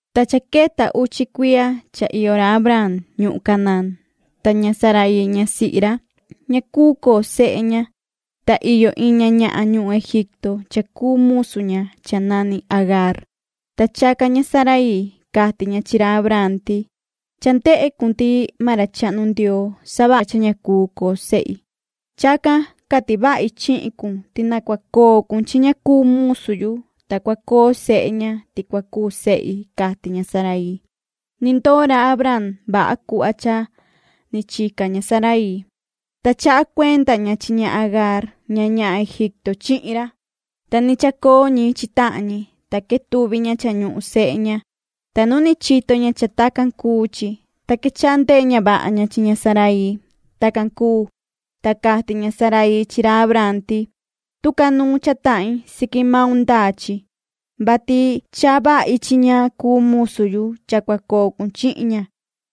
Ta cha queta uchi cuiya cha iyo ra Abraam ñuhun Canaán. Ta ña Saraii ñasihi ra, ña cuu coo sehe ña, ta iyo iin ña ñahan ñuhun Egipto cha cuu musu ña cha nani Agaar. Ta chacan ña Saraii, cati ña chi ra Abraam ti: ―Cha ndehe cun ti maan ra chahnu Ndioo savaha cha ña cuu coo sehi. Chacan cati vahi chihin cun ti na cua coo cun chi ña cuu musu yu, ta cua coo sehe ña, ti cua cuu sehi ―cati ña Saraii. Ni ndoo ra Abraam vaha cuhva cha ni chica ña Saraii. Ta chaha cuenda ña chi ña Agaar ña ñahan Egipto chihin ra. Ta ni chacoo ñi chi tahan ñi, ta quetuvi ña cha ñuhun sehe ña, ta nu ni chito ña cha tacan cuu chi, ta quechaha ndehe ña vaha ña chi ña Saraii. Tacan cuu, ta cati ña Saraii chi ra Abraam ti: ―Tucanuun cha tahin siqui maun ndaa chi, vati chaha vahi chi ña cuu musu yu cha cua coo cun chihin ña,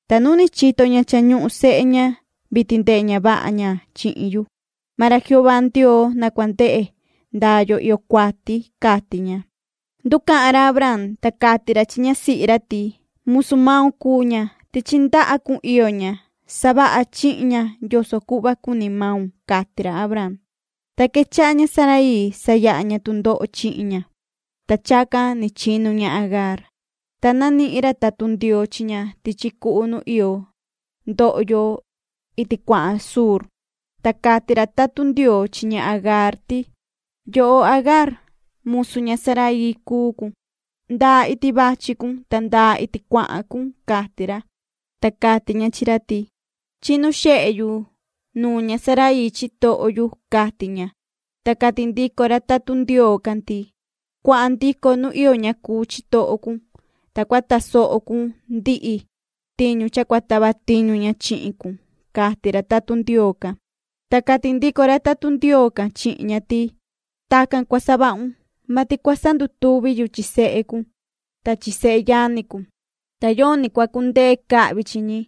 ta nu ni chito ña cha ñuhun sehe ña. Vitin ndehe ña vaha ña chihin yu. Maan ra Jehová Ndioo na cua ndehe ndaa yo iyo cuati ―cati ña. Nducahan ra Abraam, ta cati ra chi ñasihi ra ti: ―Musu maun cuu ña. Tichi ndaha cun iyo ña. Savaha chihin ña yoso cuhva cuni maun ―cati ra Abraam. Ta quechaha ña Saraii sayaha ña tundoho chihin ña, ta chacan ni chinu ña Agaar. Ta nanihin ra tatun Ndioo chi ña tichi cuhu nu iyo ndohyo iti cuahan Shur. Ta cati ra tatun Ndioo chi ña Agaar ti: ―Yoho Agaar, musu ña Saraii cuu cun. ¿Nda iti vachi cun ta nda iti cuahan cun? ―cati ra. Ta cati ña chi ra ti: ―Chinu xehe yu nuun ña Saraii chitoho yu ―cati ña. Ta cati ndico ra tatun ra Ndioo can ti: ―Cuahan ndico nu iyo ña cuu chitoho cun, ta cua tasoho cun ndihi tiñu cha cua tava tiñu ña chihin cun ―cati ra tatun Ndioo can. Ta cati ndico ra tatun Ndioo can chihin ña ti: “Tacan cua savahun, vati cua sandutuvi yu chi sehe cun ta chi seyani cun, ta yoni cua cundee cahvi chi ñi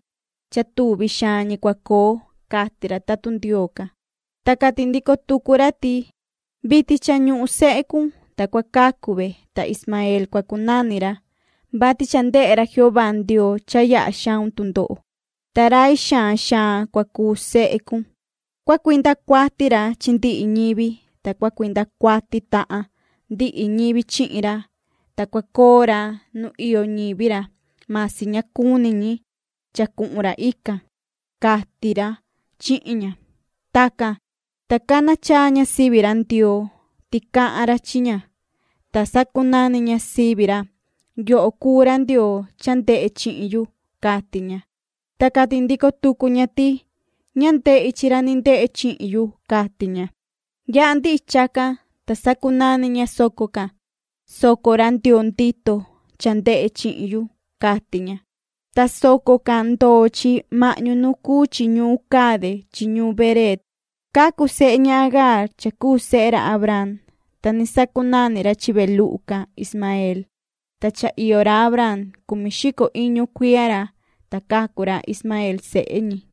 cha tuvi xaan ñi cua coo”, cati ra tatun Ndioo can. Ta cati ndico tucu ra ti: “Vitin cha ñuhun sehe cun, ta cua cacu ve, ta Ismaeel cua cunani ra, vati cha ndehe ra Jehová Ndioo cha yaha xaun tundoho. Ta rai xaan xaan cua cuu sehe cun. Cua cuinda cuati ra chi ndihi ñivi. Ta cua cuinda cuati tahan ndihi ñivi chihin ra. Ta cua coo ra nu iyo ñivi ra, masi ña cuni ñi cha cuhun ra ican”, cati ra chihin ña. Tacan, ta cana chaa ña sivi ra Ndioo, ti cahan ra chi ña, ta sacunani ña sivi ra: “Yoho cuu ra Ndioo cha ndehe chihin yu”, cati ña. Ta cati ndico tucu ña ti: “Ña ndehi chi ra ni ndehe chihin yu”, cati ña. Yaha ndihi chacan, ta sacunani ña soco can:” Soco ra Ndioo ndito cha ndehe chihin yu”, cati ña. Ta soco can ndoo chi mahñu nu cuu chi ñuun Cade chi ñuun Bereed. Cacu sehe ña Agaar cha cuu sehe ra Abraam, ta ni sacunani ra chi ve luhu can Ismaeel. Ta cha iyo ra Abraam cumi xico iñu cuiya ra, ta cacu ra Ismaeel sehe ñi.